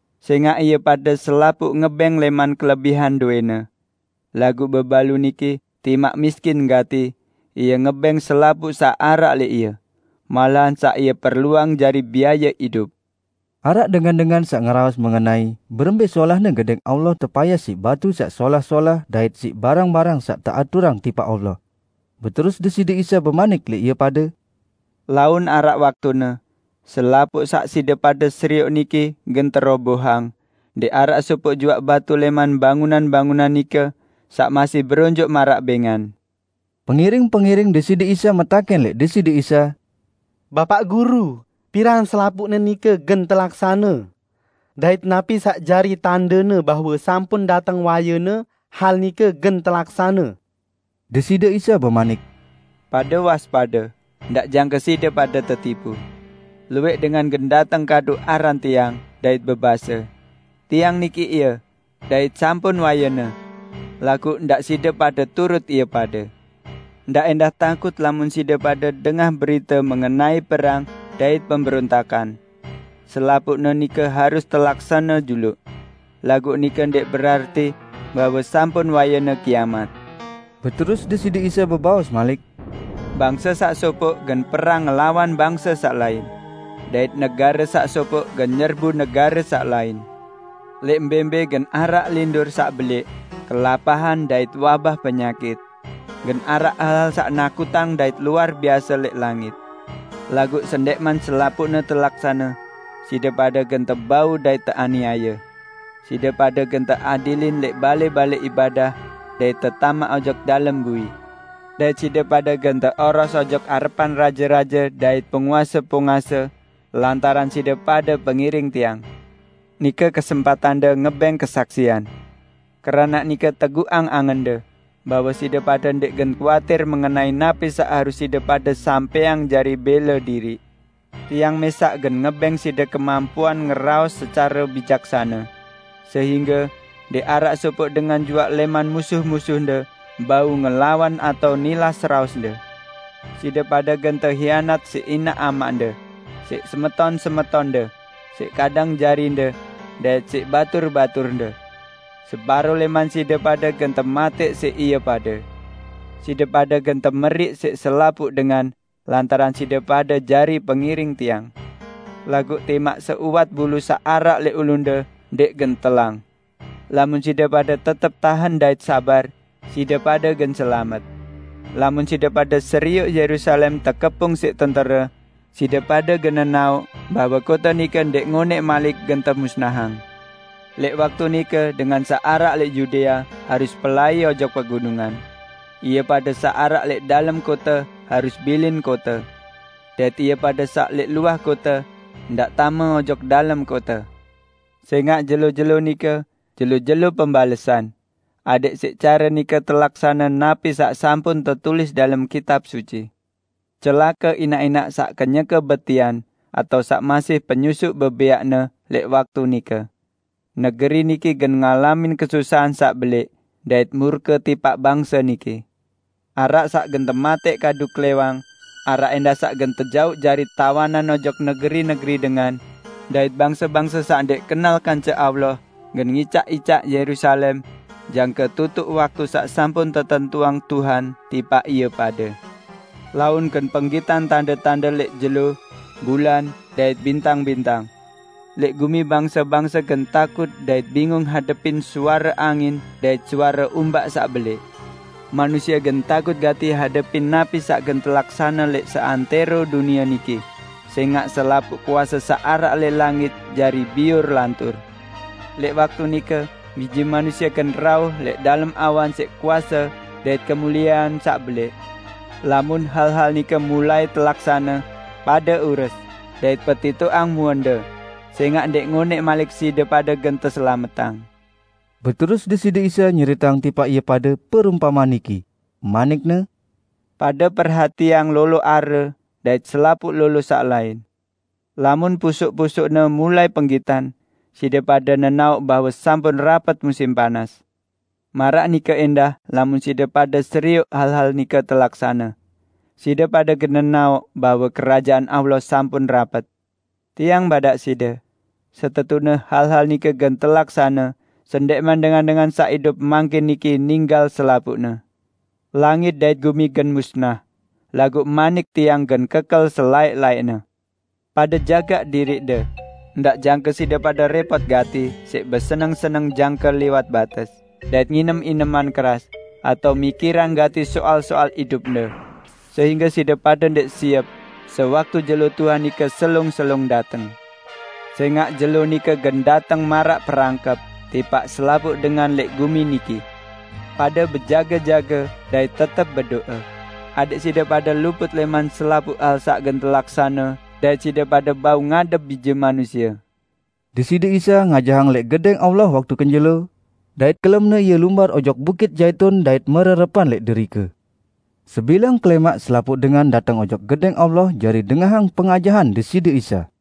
Sẽngaq ie pade selapuq ngebẽng lẽman kelebihan dowẽne. Laguq bebalu niki, timaq miskin gati, ie ngebẽng selapuq saq araq lẽq ie, malahan saq ie perluang jari biaye idup." Araq dengan-dengan saq ngeraos mengenai berembẽ solahne Gedẽng Allah tepayas siq batu saq solah-solah dait siq barang-barang saq teaturang tipaq Allah. Beterus Deside Isa bemanik lẽq ie pade, "Laun araq waktune, selapuq saq side pade serioq niki gen terobohang; ndẽq araq sopoq juaq batu lẽman bangunan-bangunan nike saq masih beronjoq maraq bẽngan!" Pengiring-pengiring Deside Isa metakẽn lẽq Deside Isa, "Bapaq Guru, piran selapuqne nike gen telaksane? Dait napi saq jari tandene bahwe sampun dateng wayene hal nike gen telaksane?" Deside Isa bemanik, "Pade waspade, ndaq jangke side pade tetipu. Luwẽq dengan gen dateng kadu aran Tiang, dait bebase, 'Tiang niki Ie!' dait 'Sampun wayene.' Laguq ndaq side pade turut ie pade. Ndaq ẽndah takut lamun side pade dengah berite mengenai perang dait pemberontakan. Selapuqne nike harus telaksane juluq. Laguq nike ndẽq berarti bahwe sampun wayene kiamat." Beterus Deside Isa bebaos malik, "Bangse saq sopoq gen perang ngelawan bangse saq lain dait negare saq sopoq gen nyerbu negare saq lain. Lẽq mbẽ-mbẽ gen araq lindur saq belẽq, kelapahan dait wabah penyakit. Gen araq hal-hal saq nakutang dait luar biase lẽq langit. Laguq sendẽqman selapuqne telaksane, side pade gen tebau dait teaniaye. Side pade gen teadilin lẽq balẽ-balẽ ibadah dait tetamaq ojok dalem bui. Dait side pade gen teoros ojok arepan raje-raje dait penguase-penguase lantaran side pade pengiring Tiang. Nike kesempatande ngebẽng kesaksian. Keranaq nike teguqang angende bahwe side pade ndẽq gen kuatir mengenai napi saq harus side pade sampẽang jari bẽle diriq. Tiang mẽsaq gen ngebẽng side kemampuan ngeraos secare bijaksane, sehingge ndẽq araq sopoq dengan juaq lẽman musuh-musuhde bau ngelawan atao nilas raosde. Side pade gen tehianat siq inaq amaqde, siq semeton-semetonde, siq kadang jarinde dait siq batur-baturde. Separo lẽman side pade gen tematẽq siq ie pade. Side pade gen temeriq siq selapuq dengan lantaran side pade jari pengiring Tiang. Laguq timaq seuwat bulu saq araq lẽq ulunde ndẽq gen telang. Lamun side pade tetep tahen dait sabar, side pade gen selamet." "Lamun side pade serioq Yerusalem tekepung siq tentere, side pade gen nenaoq bahwe kote nike ndẽq ngonẽq malik gen temusnahang. Lẽq waktu nike dengan saq araq lẽq Yudea harus pelai ojok pegunungan. Ie pade saq araq lẽq dalem kote harus bilin kote, dait ie pade saq lẽq luah kote, ndaq tame ojok dalem kote. Sẽngaq jelo-jelo nike 'Jelo-jelo Pembalesan', adẽq siq care nike telaksane napi saq sampun tetulis dalem Kitab Suci. Celake inaq-inaq saq kenyeke betian atao saq masih penyusuq bebẽaqne lẽq waktu nike! Negeri niki gen ngalamin kesusahan saq belẽq, dait murke tipaq bangse niki. Araq saq gen tematẽq kadu klẽwang, araq ẽndah saq gen tejauq jari tawanan ojok negeri-negeri dengan; dait bangse-bangse saq ndẽq kenal kance Allah gen ngicaq-icaq Yerusalem jangke tutuq waktu saq sampun tetentuang Tuhan tipaq ie pade." "Laun gen penggitan tande-tande lẽq jelo, bulan, dait bintang-bintang. Lẽq gumi bangse-bangse gen takut dait bingung hadepin suare angin dait suare umbak saq belẽq. Manusie gen takut gati hadepin napi saq gen telaksane lẽq seantẽro dunie niki, sẽngaq selapuq kuase saq araq lẽq langit jari biur lantur. Lẽq waktu nike Bije Manusie gen rauh lẽq dalem awan siq kuase dait kemuliean saq belẽq. Lamun hal-hal nike mulai telaksane, pade ures dait petitoqang muende, sẽngaq ndẽq ngonẽq malik side pade gen teselametang." Beterus Deside Isa nyeriteang tipaq ie pade perumpamean niki, manik-Ne, "Pade perhatiang lolo are dait selapuq lolo saq lain. Lamun pusuk-pusukne mulai penggitan, side pade nenaoq bahwe sampun rapet musim panas. Maraq nike ẽndah lamun side pade serioq hal-hal nike telaksane, side pade gen nenaoq bahwe Kerajaan Allah sampun rapet. Tiang badaq side: Setetune hal-hal nike gen telaksane sendẽqman dengan-dengan saq idup mangkin niki ninggal selapuqne. Langit dait gumi gen musnah, laguq manik Tiang gen kekel selaẽq-laẽqne." "Pade jagaq diriqde, ndaq jangke side pade rẽpot gati siq beseneng-seneng jangke liwat bates dait nginem ineman keras, atao mikirang gati soal-soal idupde, sehingge side pade ndẽq siep sewaktu jelo Tuhan nike selung-selung dateng. Sẽngaq Jelo nike gen dateng maraq perangkep tipaq selapuq dengan lẽq gumi niki. Pade bejage-jage dait tetep bedo'e adẽq side pade luput lẽman selapuq hal saq gen telaksane dait side pade bau ngadep Bije Manusie." Deside Isa ngajahang lẽq Gedẽng Allah waktu kenjelo, dait kelemne Ie lumbar ojok Bukit Zaitun dait mererepan lẽq derike. Sebilang kelẽmaq selapuq dengan dateng ojok Gedẽng Allah jari dengahang pengajahan Deside Isa.